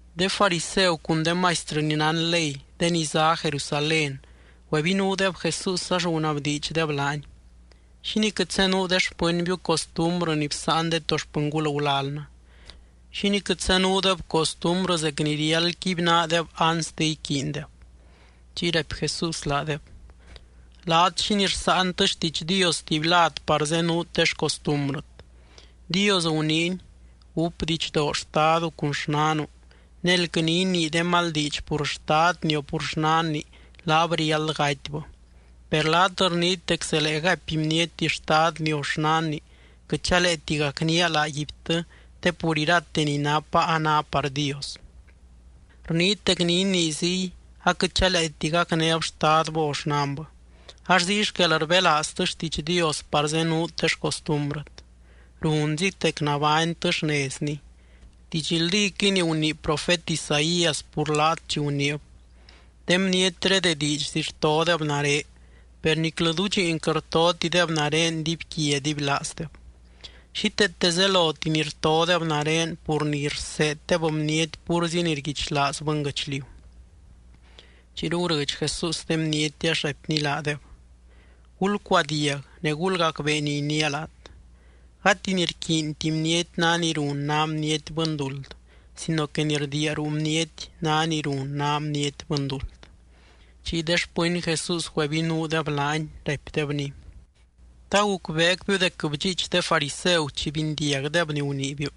De fariseu cun de maistrɨ ni nán ley de ni zá Jerusalén güebinuudeb Jesús ax gunabdiidxdeb laany: —¿Xínii quɨt zenuu de xpɨnbiu costumbrɨ ni bsáan de to xpɨngul gulalnɨ? ¿Xínii quɨt zenuudeb costumbrɨ zec ni riáld quibynaadeb anste iquiindeb? Chiy raipy Jesús laadeb: —Laat, ¿xínii rsáantɨ xtiidx Dios tuby lad par zenuut de xcostumbrɨt? Dios guniiny: “Gúp didxdoo xtadu cun xnanu”, ne “Elquɨ ni inii de mal diidx pur xtadni o pur xnanni laab riáld gatybɨ.” Per laat rniit dec zelee gaipy bniety xtadni o xnanni: “Quɨt chaleeti gacnía laaguibtɨ te pur irate ni napa a ná par Dios.” Rniit dec ni inii ziy, aquɨt chaleeti gacnéb xtadbɨ o xnanbɨ. Ax ziy xquel rbelaaztɨ xtiidx Dios par zenuut de xcostumbrɨt. ¡Runzit dec nabánytɨ xnezni! Didxldíquɨy ni gunii profet Isaías pur laat chi guniib: De bnietré de diidxzi rtodeb nare, per niclɨ dudxiin quɨt rtotideb nare dibyquia dibylaazdeb. Xíteete zeloti ni rtodeb nare pur ni rseeddeb bniety púrzi ni rguichlaaz bɨnguɨchliu. Chiyru gurɨdx Jesús de bniety ax raipny laadeb: —Gulcuadiag ne gulgacbee ni iniia laat. Gati ni rquiinti bniety ná ni run ná bniety bɨnduld sino que ni rdiia ruu bniety ná ni run ná bniety bɨnduld. Chiy de xpɨny Jesús güebinuudeb laany, raipdebny: —¿Ta gucbeecbiu dec bdxiich de fariseu chi bindiagdeb ni guniibiu?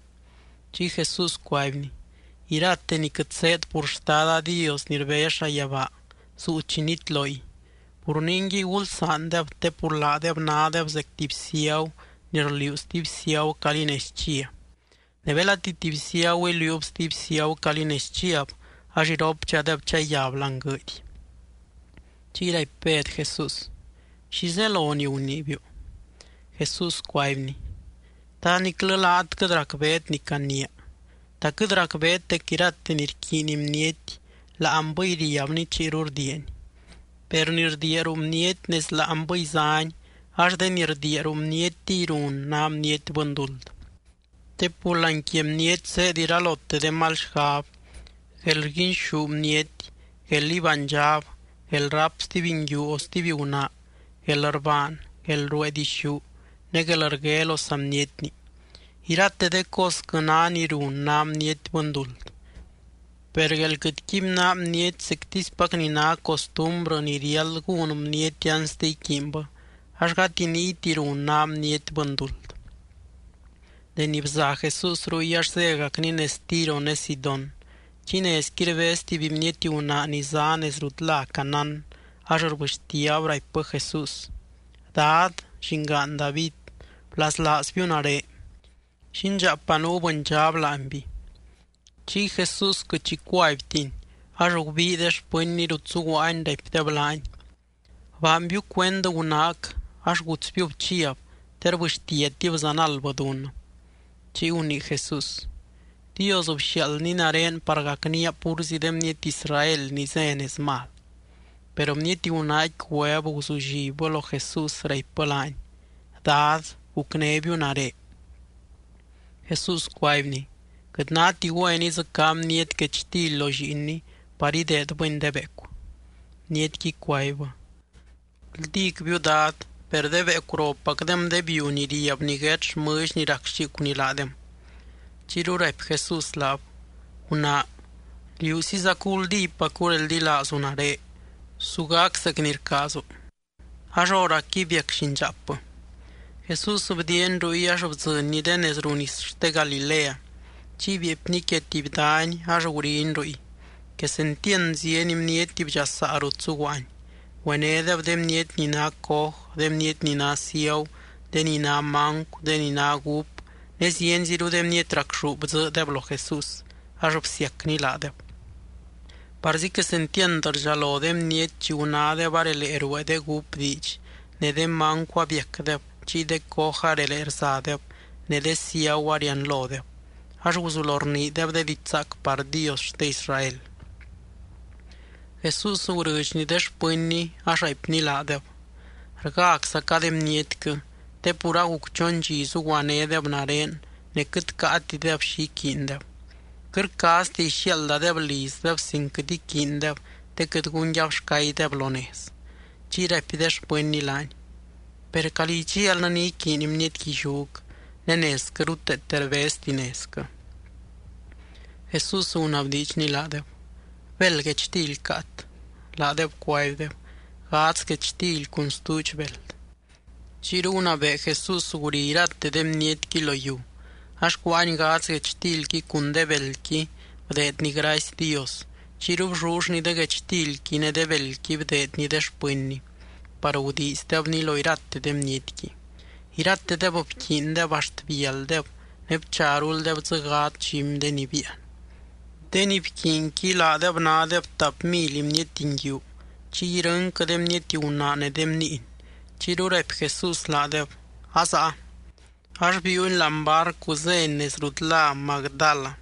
Chiy Jesús cuaibny: —Irate ni quɨt zéed pur Xtada Dios ni rbez llayabaa, zuu chi nitloy. Pur ningui, gulsaandeb te pur laadeb nádeb zec tuby ciagu ni rliuu stuby ciagu calí nez chia. Ne belati tuby ciagu iliuub stuby ciagu calí nez chiab, ax iropdxadeb chayab láani guɨɨdy. Chiy raipy Bed Jesús: —¿Xi zelo ni guniibiu? Jesús cuaibny: —¿Ta niclɨ laat quɨt racbeet ni caniia? ¿Ta quɨt racbeet dec irate ni rquiiny bniety láanbɨy riabni chiyru rdiiani? Per ni rdiia ruu bniety nez láanbɨy záni, ax de ni rdiia ruu bnietiy run ná bniety bɨnduld. Te pur láani quia bniety zéed iralote de mal xgab, guelrguinxú bniety, guél ibánydxab, guelráp stuby nguiu o stuby gunaa, guelrbaan, guelruee dixú ne guelrgue lo saa bnietni. Irate de cosquɨ ná ni run ná bniety bɨnduld. Per guél quɨt quibynaa bniety zectispac ni ná costumbrɨ ni riáld gún bniety anste iquiinbɨ, ax gati niyti run ná bniety bɨnduld. Deni bza Jesús ruy ax zégacny nez Tiro ne Sidón. Chiy nezqui rbez tuby bniety gunaa ni zá nez rut lá Canaán, ax rbɨxtiab raipbɨ Jesús: —¡Dad, Llingaan David, blaslaazbiu nare! Llindxaapa nuu bɨndxab láanby. Chiy Jesús quɨt xi cuaibtiny. Ax gubii de xpɨnny rut zuguaany, raipdeb laany: —Baanbiu cuend gunaac ax gutsbiub chiab, te rbɨxtiatib zanaldbɨ dunnɨ. Chiy gunii Jesús: —Dios bxiaaldny nare par gacnía púrzi de bniety Israel ni zé nez mal. Per bniety gunaaqui güeb guzullibbɨ lo Jesús, raipbɨ laany: —¡Dad, gucnébiu nare! Jesús cuaibny: —Quɨt náti güen idzɨcá bniety guechtily lo lliinni par ideedbɨni de beecu. Bnietqui cuaibbɨ: —Guldícbiu, Dad, per de beecu ropacdem de biu ni riab niguét xmɨlly ni rac xicuni laadem. Chiyru raipy Jesús laab: —¡Gunaa, liúsizacu guldípacu reldilaazu nare! Su gac zec ni rcaazu. Ax hóracqui biac llindxaapbɨ. Jesús bdiiany ruy ax bdzɨnny de nez ruu nis xte Galilea, chiy bieepny quia tuby dany ax guriny ruy. Quesentiand zieny bniety bdxasaa rut zuguaany. Güenédeb de bniety ni ná coj, de bniety ni ná ciagu, de ni ná mancu, de ni ná gúp ne zienziru de bniety racxú bdzɨɨdeb lo Jesús, ax bsiacny laadeb. Parzi quesentiand rdxalo de bniety chi gunádeb arelee ruee de gúp diidx, ne de mancu abiacdeb, chiy de coj arelee rzadeb, ne de ciagu arianlodeb. Ax guzulo rniideb de diidx zaac par Dios xte Israel. Jesús gurɨdxny de xpɨnny, ax raipny laadeb: —Rgáczaca de bnietquɨ, te pur aguc chon dxi zuguanédeb nare ne quɨt caatideb xi iquiindeb. Quɨt rcaaztia ixiaaldadeb lizdeb sin quɨt iquiindeb te quɨt gun yabxcaydeb lo nez. Chiy raipy de xpɨnny laany: —Per, ¿calí idxialnɨ ni iquiiny bniety guilliúc ne nezquɨ ruteete rbezti nezquɨ? Jesús gunabdiidxny laadeb: —¿Béld guechtily caat? Laadeb cuaibdeb: —Gadz guechtily cun stuudx beld. Chiyru gunabee Jesús guri irate de bnietqui lo yiu. Ax cuáany gadz guechtilqui cun de beldqui, bdeedny gracy Dios. Chiyru bllullny de guechtilqui ne de beldqui bdeedny de xpɨnny par gudiizdebni lo irate de bnietqui. Iratedeb bquiindeb axt bialdeb ne bcharuldeb dzɨ gadz dxumy de ni biian. De ni bquiinqui laadeb nádeb tap mily bniety nguiu, chiy irɨnquɨ de bniety gunaa ne de bniiny. Chiyru raipy Jesús laadeb: “Azaa.” Ax biiuny láani barcu zény nez rut lá Magdala.